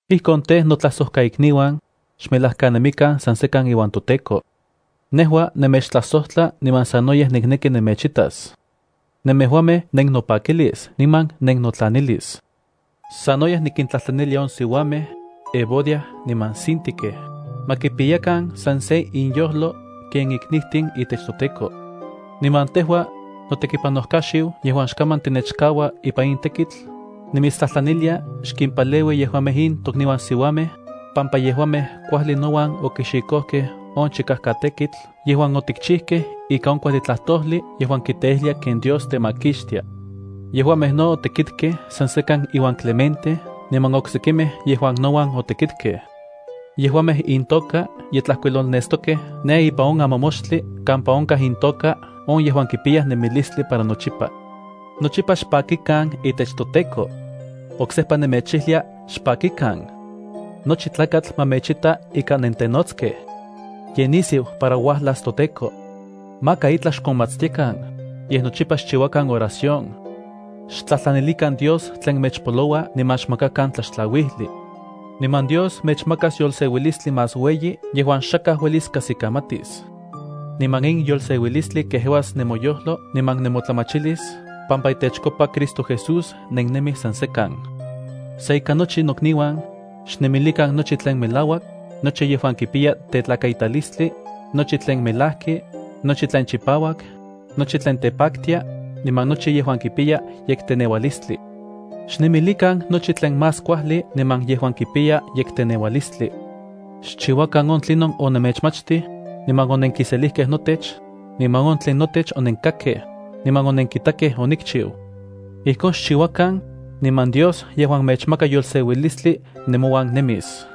Ijkon tej, notlajsojkainiuan, xmelajkanemikan san sekan iuan toTEKO. Nejua nemechtlajsojtla niman sanoyej nikneki nemechitas. Nemejuamej nennopakilis niman nennotlanilis. Sanoyej nikintlajtlanilia on siuamej, Evodia niman Síntique, ma kipiyakan san se inyojlo ken iknijtin itech toTEKO. Niman tejua, notekipanojkaxiu yejuan xkaman tinechkaua ipan in tekitl, nimitstlajtlanilia xkimpaleui yejuamej in tokniuan siuamej, pampa yejuamej kuajli nouan okixikojkej on chikajkatekitl yejuan otikchijkej ika on kuajli tlajtojli yejuan kiteijlia ken Dios temakixtia. Yejuamej no otekitkej san sekan iuan Clemente niman oksekimej yejuan nouan otekitkej. Yejuamej intoka ye tlajkuilolnestokej ne ipan on amamoxtli kampa onkaj intoka on yejuan kipiyaj nemilistli para nochipa. Nochipa xpakikan itech toTEKO. Oksejpa nemechijlia: ¡Xpakikan! Nochi tlakatl ma mechta ika nentenotskej. Ye nisiu para uajlas toTEKO. Maka itlaj xkonmatstiakan, yej nochipa xchiuakan oración. Xtlajtlanilikan Dios tlen mechpaloua niman xmakakan tlaxtlauijli. Niman Dios mechmakas yolseuilistli más ueyi yejuan xakaj uelis kajsikamatis. Niman in yolseuilistli kejeuas nemoyojlo niman nemotlamachilis pampa itechkopa Cristo Jesús nennemij san sekan. Sa ika nochi, nokniuan, xnemilikan nochi tlen melauak, nochi yejuan kipiya tetlakaitalistli, nochi tlen melajki, nochi tlen chipauak, nochi tlen tepaktia, niman nochi yejuan kipiya yekteneualistli. Xnemilikan nochi tlen más kuajli niman yejuan kipiya yekteneualistli. Xchiuakan on tlinon onemechmachtij, niman onenkiselijkej notech, niman on tlen notech onenkakkej, niman onenkitakej onikchiu. Ijkon xchiuakan, niman Dios yejuan mechmaka yolseuilistli nemouan nemis.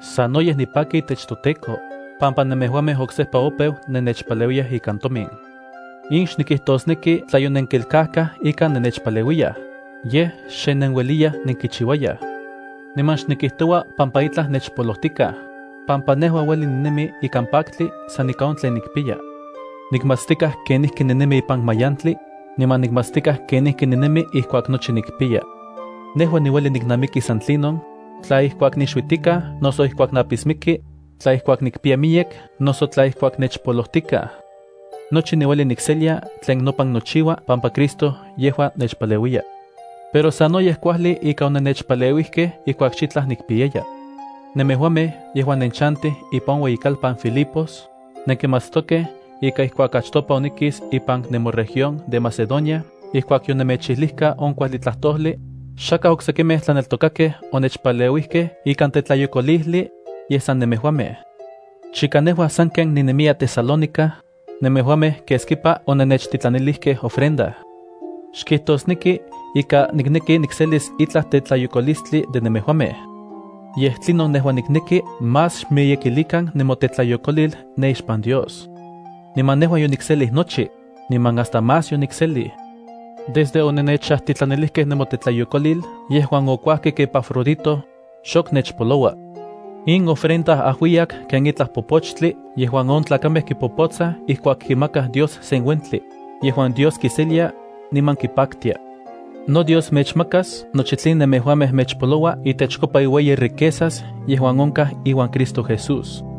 Sanoyej nipaki itech toTEKO, pampa nemejuamej oksejpa opeu nennechpaleuiyaj ikan tomin. In xnikijtosneki tla yonenkelkajkaj ika nennechpaleuiyaj, yej xe nenueliyaj nenkichiuayaj. Niman xnikijtoua pampa itlaj nechpolojtikaj, pampa nejua ueli ninemi ikan paktli san ika on tlen nikpiya. Nikmatstikaj kenijki ninemi ipan mayantli, niman nikmatstikaj kenijki ninemi ijkuak nochi nikpiya. Nejua niueli niknamiki san tlinon, tla ijkuak nixuitikaj noso ijkuak napismiki, tla ijkuak nikpiya miyek noso tla ijkuak nechpolojtikaj. Nochi niueli nikselia tlen nopan nochiua pampa Cristo yejua nechpaleuiya. Pero sanoyej kuajli ika onennechpaleuijkej ijkuak xitlaj nikpiyaya. Nemejuamej, yejuan nenchantij ipan on ueyikalpan Filipos, nenkimatstokej ika ijkuak achtopa onikis ipan nemoregión de Macedonia ijkuak yonemechijlijka on kuajli tlajtojli, xakaj oksekimej tlaneltokakej onechpaleuijkej ikan tetlayokolijli, yej san nemejuamej. Chika nejua sanken ninemiya Tesalónica, nemejuamej keskipa onennechtitlanilijkej ofrenda. Xkijtosneki ika nikneki nikselis itlaj tetlayokolistli de nemejuamej. Yej tlinon nejua nikneki más xmiyekilikan nemotetlayokolil ne ixpan Dios. Niman nejua yonikselij nochi, niman hasta más yonikselij. Desde onennechajtitlanilijkej nemotetlayokolil yejuan okuajkik Epafrodito, xok nechpoloua. In ofrenda ajuiyak ken itlaj popochtli yejuan on tlakamej kipopotsaj ijkuak kimakaj Dios sen uentli, yejuan Dios kiselia, niman kipaktia. NoDios mechmakas nochi tlen nemejuamej mechpoloua itechkopa iueyi riquezas yejuan onkaj iuan Cristo Jesús.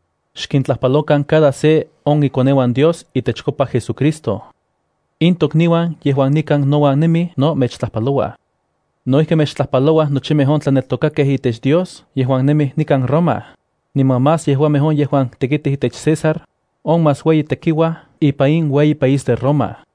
Xkintlajpalokan cada se on ikoneuan Dios itechkopa JesuCristo. In tokniuan yejuan nikan nouan nemij no mechtlajpalouaj. No ijki mechtlajpalouaj nochimej on tlanelkokakej itech Dios yejuan nemij nikan Roma, niman más yejuamej on yejuan tekitij itech César, on más ueyi tekiuaj, ipan in ueyi país Roma.